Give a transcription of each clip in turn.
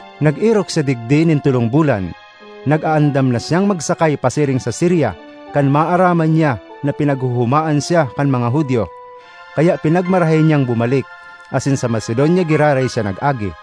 Nag-erok siya digdi nin tolong bulan. Nag-aandam na siyang magsakay pasiring sa Siria kan maaraman niya na pinaghohomaan siya kan mga Judio. Kaya pinagmarahay niyang bumalik, asin sa Macedonia giraray siya nag-agi.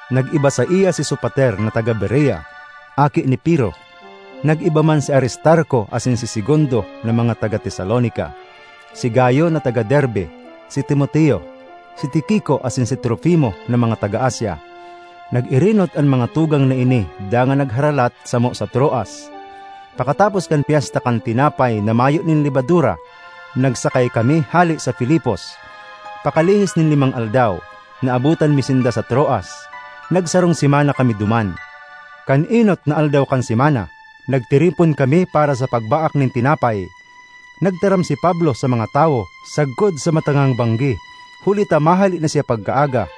Nag-iba saiya si Sopater na taga Berea, aki ni Pirro; nag-iba man si Aristarco asin si Segundo na mga taga Tesalonica; si Gayo na taga Derbe; si Timoteo; si Tiquico asin si Trofimo na mga taga Asia. Nag-erenot an mga tugang na ini dangan nagharalat samo sa Troas. Pakatapos kan Pyesta kan Tinapay na Mayo nin Lebadura, nagsakay kami hale sa Filipos. Pakalihis nin limang aldaw, naabotan mi sinda sa Troas. Nagsarong semana kami duman. Kan enot na aldaw kan semana, nagtiripon kami para sa pagbaak nin tinapay. Nagtaram si Pablo sa mga tawo sagkod sa matangang banggi, huli ta mahale na siya pagkaaga.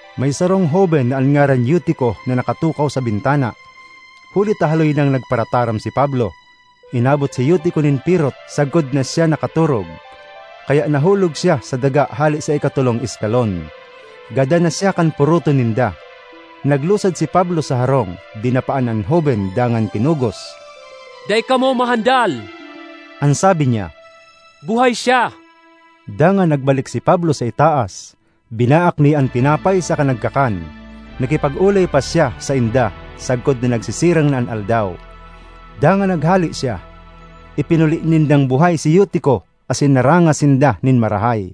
May sarong hoben na an ngaran Eutico na nakatukaw sa bintana. Huli ta haloy nang nagparataram si Pablo, inabot si Eutico nin pirot sagkod na siya nakatorog. Kaya nahulog siya sa daga hale sa ikatolong eskalon. Gadan na siya kan poroton ninda. Naglusad si Pablo sa harong, dinapaan an hoben dangan kinugos. “Dai kamo mahandal,” an sabi niya, “buhay siya!” Dangan nagbalik si Pablo sa itaas; binaak niya an tinapay saka nagkakan. Nakipag-olay pa siya sainda sagkod na nagsisirang na an aldaw. Dangan naghale siya. Ipinuli nindang buhay si Eutico asin naranga sinda nin marahay.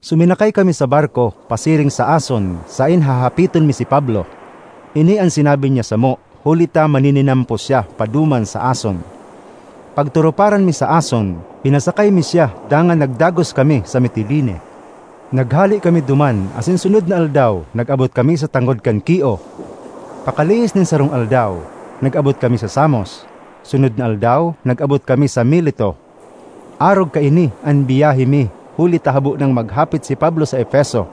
Suminakay kami sa barko pasiring sa Ason saen hahapiton mi si Pablo. Ini an sinabi niya samo huli ta manininampo siya paduman sa Ason. Pagturuparan mi sa Ason, pinasakay mi siya dangan nagdagos kami sa Mitiline. Naghale kami duman asin sunod na aldaw nag-abot kami sa tangod kan Quio. Pakalihis nin sarong aldaw, nag-abot kami sa Samos; sunod na aldaw nag-abot kami sa Mileto. Arog kaini an biyahe mi huli ta habo nang maghapit si Pablo sa Efeso,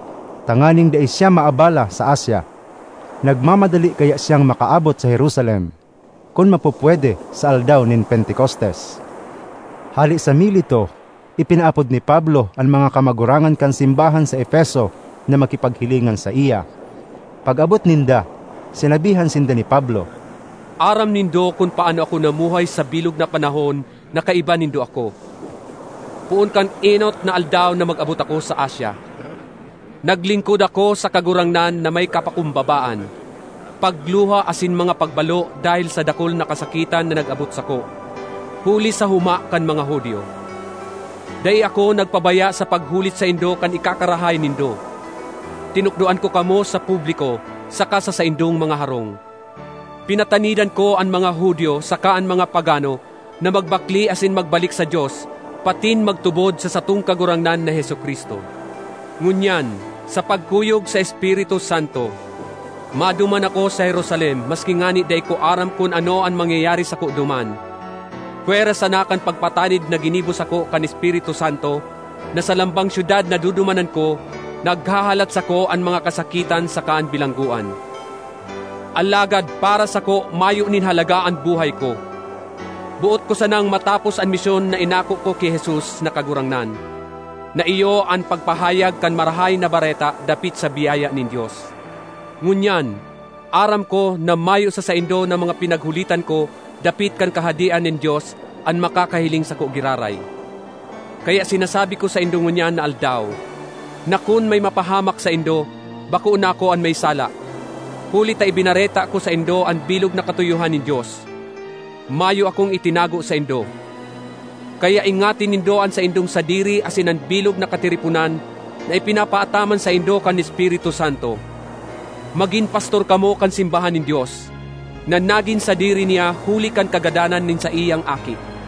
tanganing dai siya maabala sa Asia. Nagmamadali kaya siyang makaabot sa Jerusalem, kun mapupwede, sa aldaw nin Pentecostes. Hale sa Mileto, ipinaapod ni Pablo an mga kamagurangan kan simbahan sa Efeso na makipaghilingan saiya. Pag-abot ninda, sinabihan sinda ni Pablo, “Aram nindo kun paano ako namuhay sa bilog na panahon na kaiba nindo ako, poon kan enot na aldaw na mag-abot ako sa Asia. Naglingkod ako sa Kagurangnan na may kapakumbabaan, pagluha asin mga pagbalo dahel sa dakul na kasakitan na nag-abot sako huli sa homa kan mga Judio. Dai ako nagpabaya sa paghulit saindo kan ikakarahay nindo; tinukdoan ko kamo sa publiko saka sa saindong mga harong. Pinatanidan ko an mga Judio saka an mga pagano na magbakle asin magbalik sa Dios patin magtubod sa satong Kagurangnan na Jesu-Cristo. Ngunyan, sa pagkuyog sa Espiritu Santo, maduman ako sa Jerusalem maski ngani dai ko aram kun ano an mangyayari sako duman, pwera sana kan pagpatanid na ginibo sako kan Espiritu Santo na sa lambang syudad na dudumanan ko, naghahalat sako an mga kasakitan saka an bilanggoan. Alagad para sako mayo nin halaga an buhay ko; boot ko sanang matapos an misyon na inako ko ki Jesus na Kagurangnan, na iyo an pagpahayag kan Marahay na Bareta dapit sa biyaya nin Dios. ”Ngunyan aram ko na mayo sa saindo na mga pinaghulitan ko dapit kan Kahadean nin Dios an makakahiling sako giraray. Kaya sinasabi ko saindo ngunyan na aldaw, na kun may mapahamak saindo, bako na ako an may sala. Huli ta ibinareta ko saindo an bilog na katuyohan nin Dios; mayo akong itinago saindo. Kaya ingati nindo an saindong sadiri asin an bilog na katiriponan na ipinapaataman saindo kan Espiritu Santo. Magin pastor kamo kan simbahan nin Dios, na nagin sadiri niya huli kan kagadanan nin saiyang Aki.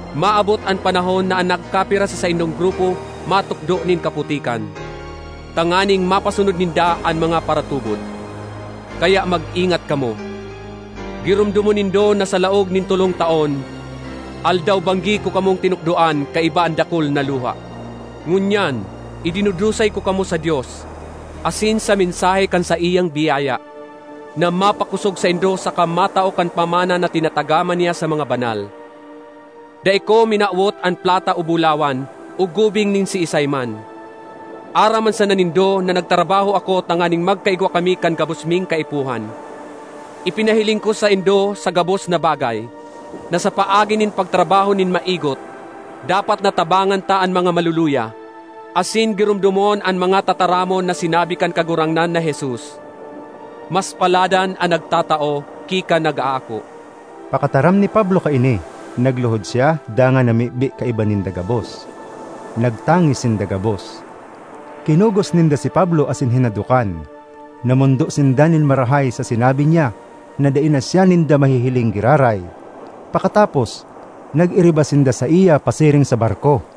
Maabot an panahon na an nagkapira sa saindong grupo matukdo nin kaputikan, tanganing mapasunod ninda an mga paratubod. Kaya mag-ingat kamo. Giromdomon nindo na sa laog nin tolong taon, aldaw-banggi ko kamong tinukdoan kaiba an dakul na luha. ”Ngunyan idinudusay ko kamo sa Dios asin sa mensahe kan saiyang biyaya, na mapakosog saindo saka matao kan pamana na tinatagama niya sa mga banal. Dai ko minawot an plata o bulawan o gubing nin siisay man. Aram man sana nindo na nagtrabaho ako tanganing magkaigwa kami kan gabos ming kaipuhan. Ipinahiling ko saindo sa gabos na bagay, na sa paagi nin pagtrabaho nin maigot, dapat na tabangan ta an mga maluluya, asin giromdomon an mga tataramon na sinabi kan Kagurangnan na Jesus, ‘Mas paladan an nagtatao ki kan nag-aako.’” Pakataram ni Pablo kaini, nagluhod siya dangan namibi kaiba ninda gabos. Nagtangis sinda gabos; kinugos ninda si Pablo asin hinadokan. Namondo sinda nin marahay sa sinabi niya na dai na siya ninda mahihiling giraray. Pakatapos, nag-iriba sinda saiya pasiring sa barko.